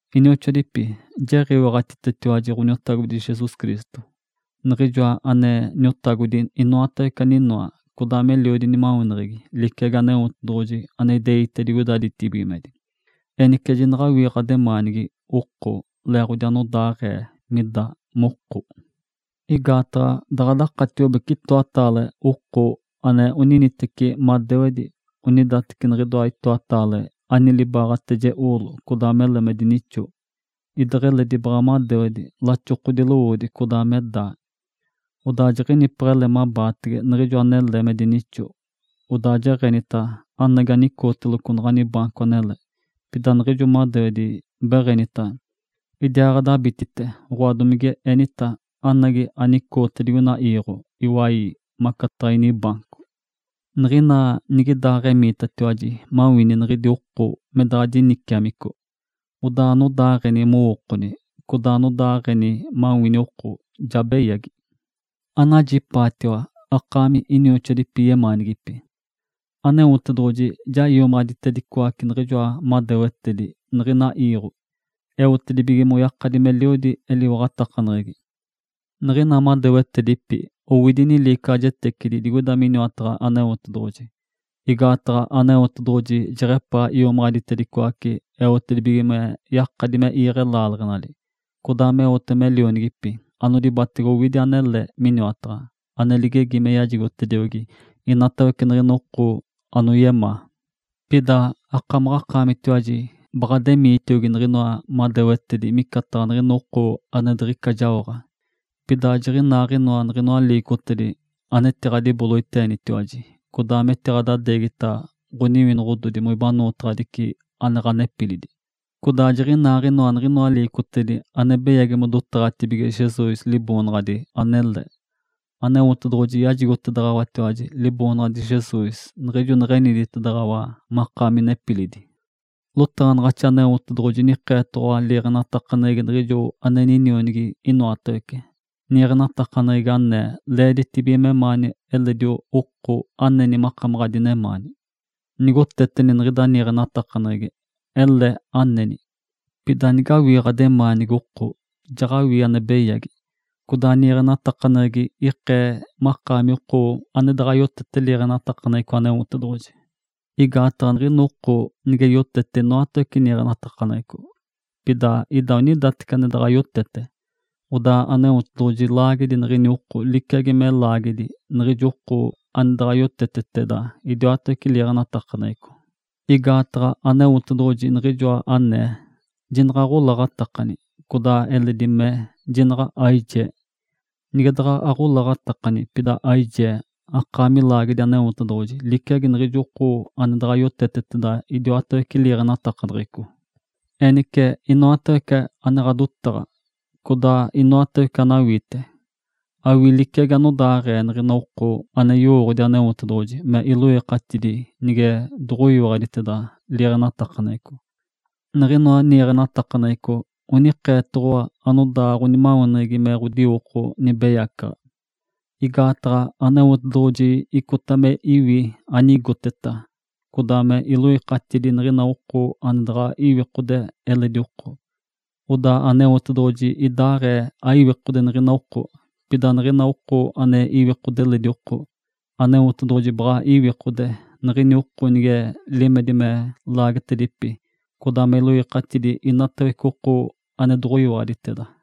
Inioxoadipi, jiɡ̶iwaɡ̶atitetiwaji Ǥoniotagodi Jesus Cristo, Niɡ̶ijoa ane Niotagodi inoatawece aninoa, codaa meliodi nimaweneɡ̶egi liciagi Aneotedoɡ̶oji ane ideite digoida ditibigimedi. Enice, jinaɡ̶awii ɡ̶ademaanigi oko leeɡ̶odi anodaaɡ̶ee mida moko. Igaataɡ̶a daɡ̶a dakatiobece itoataale oko ane oniticetiwaji mateciɡ̶i, onidateci niɡ̶idoa itoataale ani libaaɡ̶ateje oolo codaa mele me dinixo, ideɡ̶eledi baɡ̶a madewedi, laxokodi lowoodi codaa me daa. Odaa jiɡ̶inipeɡ̶ele mabaatege niɡ̶ijo anele me dinixo, odaa jeɡ̶enita, “Anagi anicooteloco naɡ̶ani baanco anele”, pida niɡ̶ijo madewedi beɡ̶enita, “Idiaaɡ̶adabititi!”, oɡ̶oa, domigenita, “Anagi anicooti digoina iiɡ̶o iwai maca inibaanco!” Niɡ̶ina nigidaaɡ̶enitiwaji, jaɡ̶awii niɡ̶idi oko me daɡ̶a diniciamico, odaa anodaaɡ̶eni mowookoni, codaa anodaaɡ̶eni mawini oko ja beyagi. Anajipaatiwa akaami inioxoadipi yemaanigipi! Aneotedoɡ̶oji ja iomaɡ̶aditedicoace niɡ̶ijoa madewetedi niɡ̶ina iiɡ̶o, eotedibige moyakadi meliodi eliwaɡ̶atakaneɡ̶egi. Niɡ̶ina madewetedipi owidi niliicaɡ̶ajetecidi digoida miniwataɡ̶a Aneotedoɡ̶oji, igaataɡ̶a Aneotedoɡ̶oji jeɡ̶epaa iomaɡ̶aditedicoace eotedibige me yakadi me iiɡ̶e laaleɡ̶enali, codaa meote me lionigipi anodibatege owidi anele miniwataɡ̶a, ane ligegi me yajigotediogi inatawece niɡ̶ina oko anoyemaa. Pida akamaɡ̶akaamitiwaji baɡ̶ademiitiogi niɡ̶inoa madewetedi micataɡ̶a niɡ̶ina oko ane diɡ̶ica jaoɡ̶a. Pida jiɡ̶inaaɡ̶inoa niɡ̶inoa liicotedi anetiɡ̶adiboloiteenitiwaji, codaa metiɡ̶adixigita ɡ̶oniwinoɡ̶odi moibanootaɡ̶adici ane ɡ̶anepilidi. Codaa jiɡ̶inaaɡ̶inoa niɡ̶inoa liicotedi ane beyagi modotaɡ̶atibige Jesus Liboonaɡ̶adi anele. Aneotedoɡ̶oji yajigotedaɡ̶awatiwaji Liboonaɡ̶adi Jesus niɡ̶ijo neɡ̶eniditedaɡ̶awa makaami nepilidi. Lotaɡ̶anaɡ̶axi Aneotedoɡ̶oji nikeetoɡ̶owa liiɡ̶enatakaneɡ̶egi niɡ̶ijo ane Ninionigi inoatawece, niiɡ̶enatakaneɡ̶egi anee, “Leeditibige memaani eledi oko aneni makamaɡ̶a adinemaani.” Nigoteteni niɡ̶ida niiɡ̶enatakaneɡ̶egi, ele aneni. Pida nigawii ɡ̶ademaanigi oko, jaɡ̶awii ane beyagi, codaa niiɡ̶enatakaneɡ̶egi ikee makaami oko ane daɡ̶a yoteteteda liiɡ̶enatakaneɡ̶eco Aneotedoɡ̶oji. Igaataɡ̶a niɡ̶ina oko nige yotete inoatawece niiɡ̶enatakaneɡ̶eco, pida ida onidateci ane daɡ̶a yotete, odaa Aneotedoɡ̶oji laagedi niɡ̶ini oko liciagi me laagedi niɡ̶ijo oko ane daɡ̶a yoteteteda idiwatawece liiɡ̶enatakaneɡ̶eco. Igaataɡ̶a Aneotedoɡ̶oji niɡ̶ijoa anee, “Jinaɡ̶aɡ̶olaɡ̶atakani!” Codaa eledi mee, “Jinaɡ̶a aijee!” Nige daɡ̶a aɡ̶olaɡ̶atakani, pida aijee, akaami laagedi Aneotedoɡ̶oji liciagi niɡ̶ijo oko ane daɡ̶a yoteteteda idiwatawece liiɡ̶enatakaneɡ̶eco. Enice, inoatawece ane ɡ̶adotaɡ̶a, codaa inoatawece anawiite, awii liciagi anodaaɡ̶ee niɡ̶ina oko ane yowooɡ̶odi Aneotedoɡ̶oji me iloikatidi nige doɡ̶oyoteteteda liiɡ̶enatakaneɡ̶eco. Niɡ̶inoa niiɡ̶enatakaneɡ̶eco onikeetoɡ̶owa anodaa ɡ̶onimaweneɡ̶egi me ɡ̶odiwoko nibeyacaɡ̶a. Igaataɡ̶a Aneotedoɡ̶oji icota me iwi anigoteta, codaa me iloikatidi niɡ̶ina oko ane daɡ̶a iwikode eledi oko. Odaa Aneotedoɡ̶oji idaaɡ̶ee aiwikode niɡ̶ini oko. Pida niɡ̶ina oko ane iwikode eledi oko, Aneotedoɡ̶oji baɡ̶a iwikode niɡ̶ini oko nige limedi me laagetedipi codaa me iloikatidi inatawece oko ane doɡ̶oyiwaɡ̶aditeda.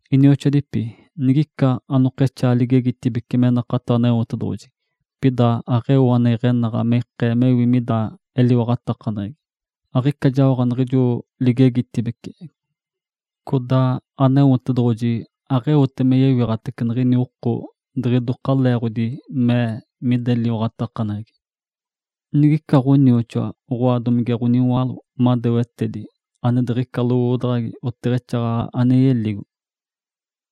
Inioxoadipi, nigica anokexaa ligegitibece me nakato Aneotedoɡ̶oji, pida aɡ̶eo ane iɡ̶enaɡ̶a me ikee mewi mida eliwaɡ̶atakaneɡ̶egi, aɡ̶ica jaoɡ̶a niɡ̶ijo ligegitibece. Codaa Aneotedoɡ̶oji aɡ̶eote me yewiɡ̶atace niɡ̶ini oko diɡ̶idoka leeɡ̶odi mee mida eliwaɡ̶atakaneɡ̶egi. Nigica ɡ̶onioxoa, oɡ̶oa domige ɡ̶oniwaalo madewetedi ane diɡ̶ica lowoodaɡ̶agi, oteɡ̶exaaɡ̶aɡ̶a ane yeligo.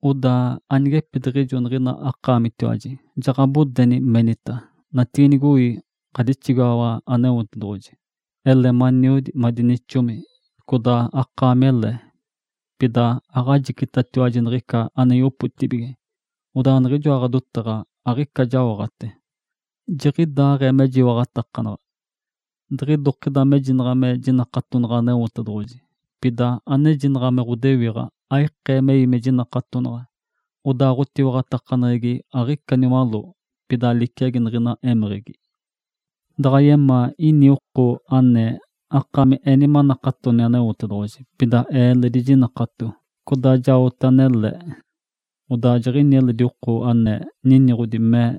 Odaa anigepidiɡ̶ijo niɡ̶ina akaamitiwaji jaɡ̶abodeni, menita, “Natiinigoi, ɡ̶adixigaɡ̶awa Aneotedoɡ̶oji! Ele maniodi, madinixomi, codaa akaamele!” Pida aɡ̶ajicitatiwaji niɡ̶ica ane yopotibige. Odaa niɡ̶ijoa ɡ̶adotaɡ̶a aɡ̶ica jaoɡ̶ate. Jiɡ̶idaaɡ̶ee mejiwaɡ̶atakanaɡ̶a. Diɡ̶idokida mejinaɡ̶a me jinakatonaɡ̶a Aneotedoɡ̶oji, pida anejinaɡ̶a me ɡ̶odewiɡ̶a aikee mewi me jinakatonaɡ̶a, odaa ɡ̶otiwaɡ̶atakaneɡ̶egi aɡ̶ica niwaló, pida liciagi niɡ̶ina émeɡ̶egi. Daɡ̶a yemaa ini oko anee, “Akaami eni manakatoni Aneotedoɡ̶oji. Pida ee eledi jinakato, codaa jaote anele.” Odaa jiɡ̶ini eledi oko ane niniɡ̶odi, mee,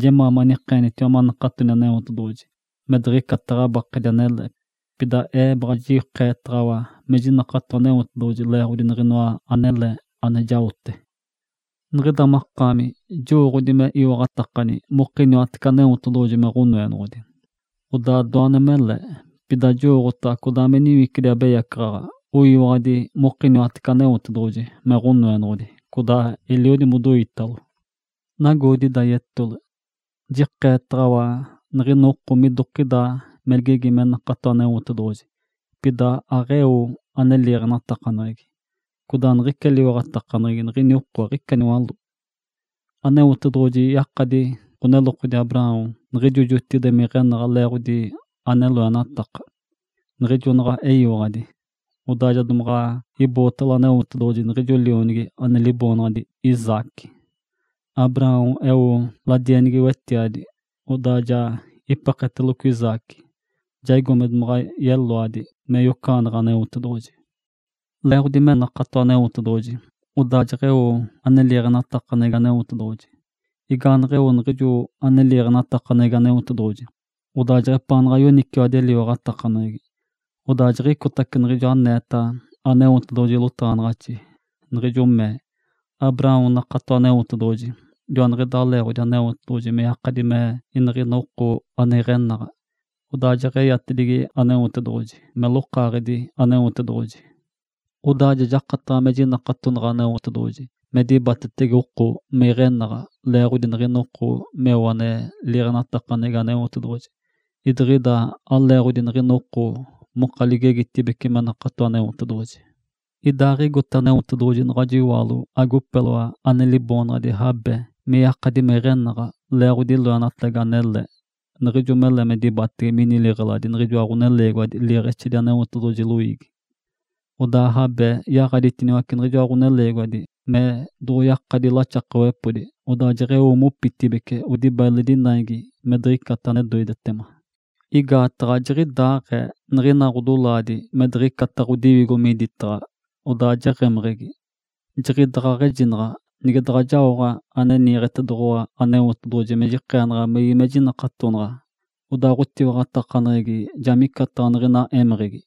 “Jemaa manikeenitiwa manakatoni Aneotedoɡ̶oji, me diɡ̶icata ɡ̶abakedi anele. Pida ee baɡ̶a jikeetaɡ̶awa me jinakato Aneotedoɡ̶oji leeɡ̶odi niɡ̶inoa anele ane jaote.” Niɡ̶ida makaami jowooɡ̶odi me iwaɡ̶atakani mokiniwatece Aneotedoɡ̶oji me Ǥonoenoɡ̶odi. Odaa doane mele! Pida jowooɡ̶otaɡ̶a codaa me niwicidi abeyacaɡ̶aɡ̶a oyiwaɡ̶adi mokiniwatece Aneotedoɡ̶oji me Ǥonoenoɡ̶odi, codaa eliodi modoitalo. Nagoodi ida yetole! Jikeetaɡ̶awa niɡ̶ina oko midokida me ligegi me nakato Aneotedoɡ̶oji, pida aɡ̶eo ane liiɡ̶enatakaneɡ̶egi, odaa niɡ̶ica eliwaɡ̶atakaneɡ̶egi niɡ̶ini oko aɡ̶ica niwaló. Aneotedoɡ̶oji yakadi ɡ̶onelokodi Abraão niɡ̶ijo jotigide me iɡ̶enaɡ̶a leeɡ̶odi ane loenataka, niɡ̶ijo naɡ̶a eyiwaɡ̶adi, odaa ja domaɡ̶a ibootalo Aneotedoɡ̶oji niɡ̶ijo lionigi ane liboonaɡ̶adi Isaque. Abraão eo ladienigi wetiadi, odaa ja ipeketeloco Isaque, jaigo me domaɡ̶a yeloadi me yocaɡ̶aneɡ̶e Aneotedoɡ̶oji. Leeɡ̶odi me nakato Aneotedoɡ̶oji, odaa jeɡ̶eo ane liiɡ̶enatakaneɡ̶egi Aneotedoɡ̶oji. Igaaneɡ̶eo niɡ̶ijo ane liiɡ̶enatakaneɡ̶egi Aneotedoɡ̶oji, odaa jeɡ̶epaanaɡ̶a yoniciwadi eliwaɡ̶atakaneɡ̶egi. Odaa jiɡ̶icotece niɡ̶ijo aneeta Aneotedoɡ̶oji lotaɡ̶anaɡ̶axi, niɡ̶ijo mee, “Abraão nakato Aneotedoɡ̶oji, joaniɡ̶idaa leeɡ̶odi Aneotedoɡ̶oji me yakadi me iniɡ̶ina oko ane iɡ̶enaɡ̶a.” Odaa jeɡ̶eyatedigi Aneotedoɡ̶oji me “Lokaaɡ̶edi Aneotedoɡ̶oji”. Odaa ja jakataɡ̶a me jinataɡ̶a Aneotedoɡ̶oji me dibatetege oko me iɡ̶enaɡ̶a leeɡ̶odi niɡ̶ina oko meo ane liiɡ̶enatakaneɡ̶egi Aneotedoɡ̶oji, idiɡ̶ida aleeɡ̶odi niɡ̶ina oko moka ligegitibece me nakato Aneotedoɡ̶oji. Idaaɡ̶igote Aneotedoɡ̶oji naɡ̶ajo iwaalo agopeloa ane liboonaɡ̶adi Raabe me yakadi me iɡ̶enaɡ̶a leeɡ̶odi loenatagi anele, niɡ̶ijo mele me dibatege mini liɡ̶eladi niɡ̶ijoa ɡ̶oneleegiwadi liiɡ̶exedi Aneotedoɡ̶oji loiigi. Odaa Raabe yaɡ̶aditiniwace niɡ̶ijoa ɡ̶oneleegiwadi me doɡ̶oyakadi laxakawepodi, odaa jeɡ̶eo mopitibeci odibata eledi naigi me diɡ̶icata ane doidetema. Igaataɡ̶a jiɡ̶idaaɡ̶ee niɡ̶ina ɡ̶odolaadi me diɡ̶icata ɡ̶odiwigo miditaɡ̶a, odaa jeɡ̶emeɡ̶egi. Jiɡ̶idaɡ̶aɡ̶a ejinaɡ̶a nige daɡ̶a jaoɡ̶a ane niiɡ̶etedoɡ̶owa Aneotedoɡ̶oji me jikeenaɡ̶a mewi mejiwaɡ̶atakanaɡ̶a, odaa ɡ̶otiwaɡ̶atakaneɡ̶egi ja micataɡ̶a niɡ̶ina émeɡ̶egi.